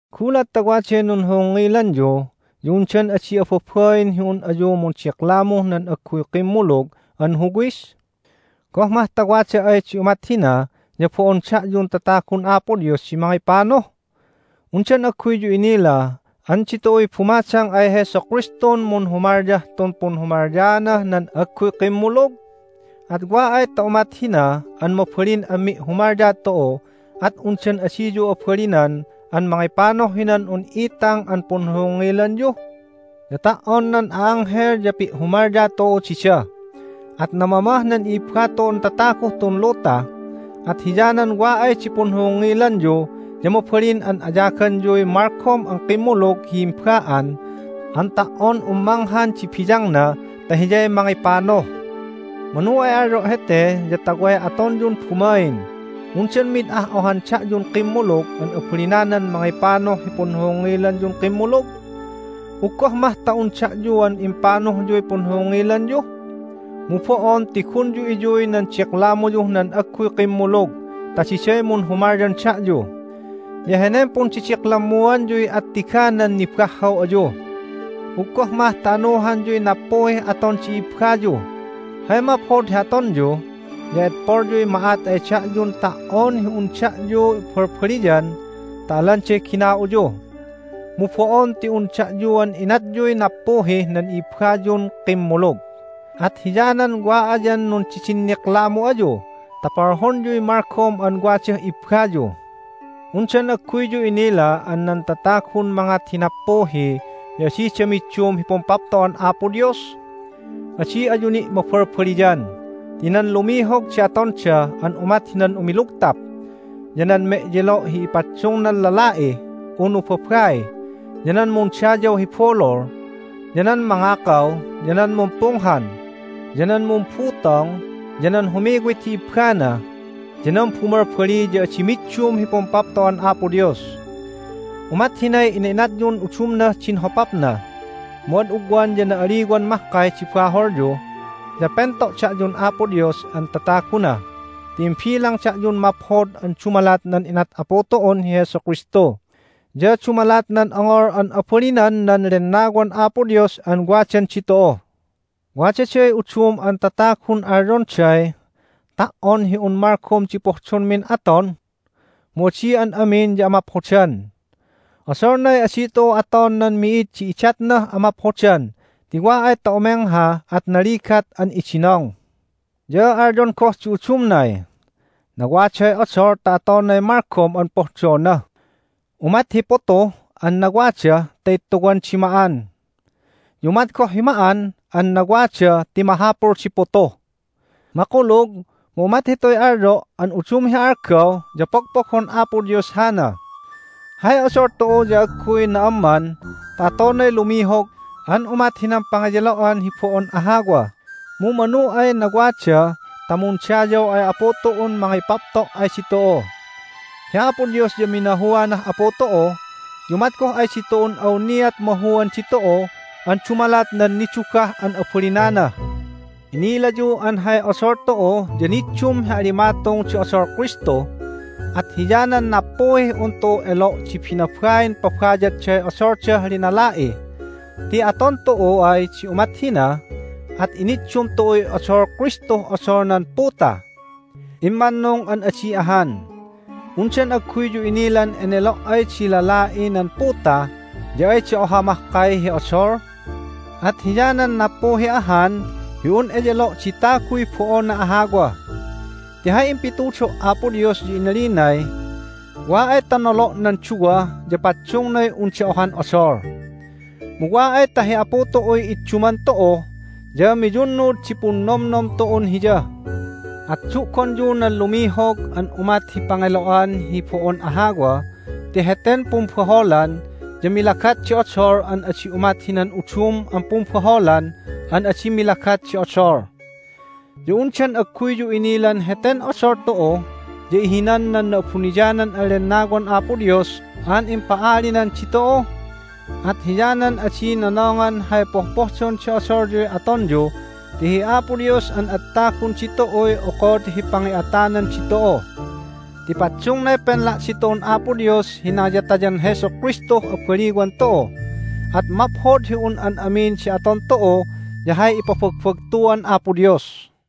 Gulat ta waday nunhohongngilanyu ya undan adi ababain hi un ayu mundiklamuh nan agguy kimmulug an huwis? Goh mah ta wada ay di umat hina ya bo'on da'yun tatagun Apo Dios di mangipanuh? Undan agguyyu inila an ditu'uy bumadang ay Jesu Kristun munhumalyah tun punhumalyaanah nan agguy kimmulug? At wa ay ta umat hina an mabalin an mi'humalya tu'u at undan adiyu abalinan an mangipanuh hinan un itang an punhohongngilanyu? Ya ta"on nan a'anghel ya pi'humalya tu'u dida, at namamah nan i'ibba tu'un tataguh tun luta! At hiyanan wa ay di punhohongngilanyu ya mabalin an ayaganyuy malgom an kimmulug hi himba'an an ta"on un manghan di biyangna ta hiyay mangipanuh! Manu ay alyo' hete ya ta way atonyun bumain! Undan mid ah ohan da'yun kimmulug an abalinanan mangipanuh hi punhohongngilanyun kimmulug? Uggoh mah ta un da'yuan impanuhyuy punhohongngilanyu? Mu bo'on ti gunyu iyuy nan diklamuyuh nan agguy kimmulug ta diday munhumalyan da'yu! Ya henen pundidiklammuanyuy attiganan nibahhaw ayu. Uggoh mah ta anuhanyuy nappuhih aton di ibbayu! Hay maphod hi atonyu ya edpolyuy ma'at ay da'yun ta"on hi un da'yu balbaliyan ta alanday gina'uyu. Mu bo'on ti un da'yuan inatyuy nappuhih nan i'ibbayun kimmulug, at hiyanan wa ayan nundidinniklamu ayu ta polhonyuy malgom an wadah ibbayu! Undan agguyyu inila an nan tatagun mangat hi nappuhi ya adida middum hi Pumpapto'an Apo Dios? Adi ayu ni' mabalbaliyan: Ti nan lumihog di atonda an umat hinan umilugtap, ya nan me'yelo' hi paddungdan lala'i unu babai, ya nan mundayaw hi bulul, ya nan mangakaw, ya nan mumpunghan, ya nan mumbutong, ya nan humiwit hi ibbana, ya nan bumalbali ya adi middum hi Pumpapto'an Apo Dios. Umat hinay ina'inatyun udumnah din hopapna. Mu ad ugwan ya na'aliwan mahkay di baholyu, ya pento' da'yun Apo Dios an tataguna ti imbilang da'yun maphod an dumalat nan inat Apu tu'un hi Jesu Kristu ya dumalat nan ongol an abalinan nan Lennawan Apo Dios an wadan ditu'u. Wadaday udum an tatagun alyonday, "Ta"on hi un malgom di pohdonmin aton." Mu adi an amin ya amaphodan. Odolnay adi tu'u aton nan mi'id di idatnah amaphodan ti wa ay ta umengha at naligat an idinong. Ya alyon goh di udumnay, "Nawaday odol ta atonay malgom an pohdona. Umat hi putu an nawada ta ittuwan di ma'an, ya umat goh hi ma'an an nawada ti mahapul di putu." Makulug, mu umat hituy alyo' an udum hi algaw ya pogpogon Apo Dios hana. Hay odol tu'u ya agguy na'amman ta atonay lumihog an umat hinan pangeyelo'an hi bo'on ahawa, mu manu ay nawada ta mundayaw ay Apu tu'un mangipapto' ay ditu'u. Hi Apo Dios ya minahuanah Apu tu'u, ya umat goh ay ditu'un awniat mahuan ditu'u an dumalat nan nidugah an abalinana. Inilayu an hay odol tu'u ya niddum hi alimatung di odol Kristu, at hiyanan nappuhih un tu'u elo' di binabain pabayadday odoldah linala'i, ti aton tu'u ay di umat hina at iniddum tu'uy odol Kristuh odol nan puta. Immannung an adi ahan! Undan agguyyu inilan enelo' ay di lala'i nan puta ya ayda oha mahkay hi odol? At hiyanan nappuhi ahan hi un eyelo' di taguy bo'ona ahawa. Ti hay impitudo' Apo Dios ya inalinay, "Wa ay ta nolo' nan duwa ya paddungnay unda ohan odol." Mu wa ay ta hi Apu tu'uy idduman tu'u ya miyunnud di punnomnom tu'un Hiya. At du'gonyu nan lumihog an umat hi pangelo'an hi bo'on ahawa ti heten pumbaholan ya milagat di odol an adi umat hinan udum an pumbaholan an adi milagat di odol. Ya undan agguyyu inilan heten odol tu'u ya ihinan nan Na'abuniyanan an Lennawan Apo Dios an impa'alinan ditu'u? At hiyanan adi nonongan hay pohpohdon di odolyuy atonyu ti hi Apo Dios an ad tagun ditu'uy okod hi pangi'atanan ditu'u. Ti paddungnay penla' ditu'un Apo Dios hi nangiyatayan Jesu Kristuh abaliwan tu'u. At maphod hi un an amin di aton tu'u ya hay ipabagbagtuan Apo Dios.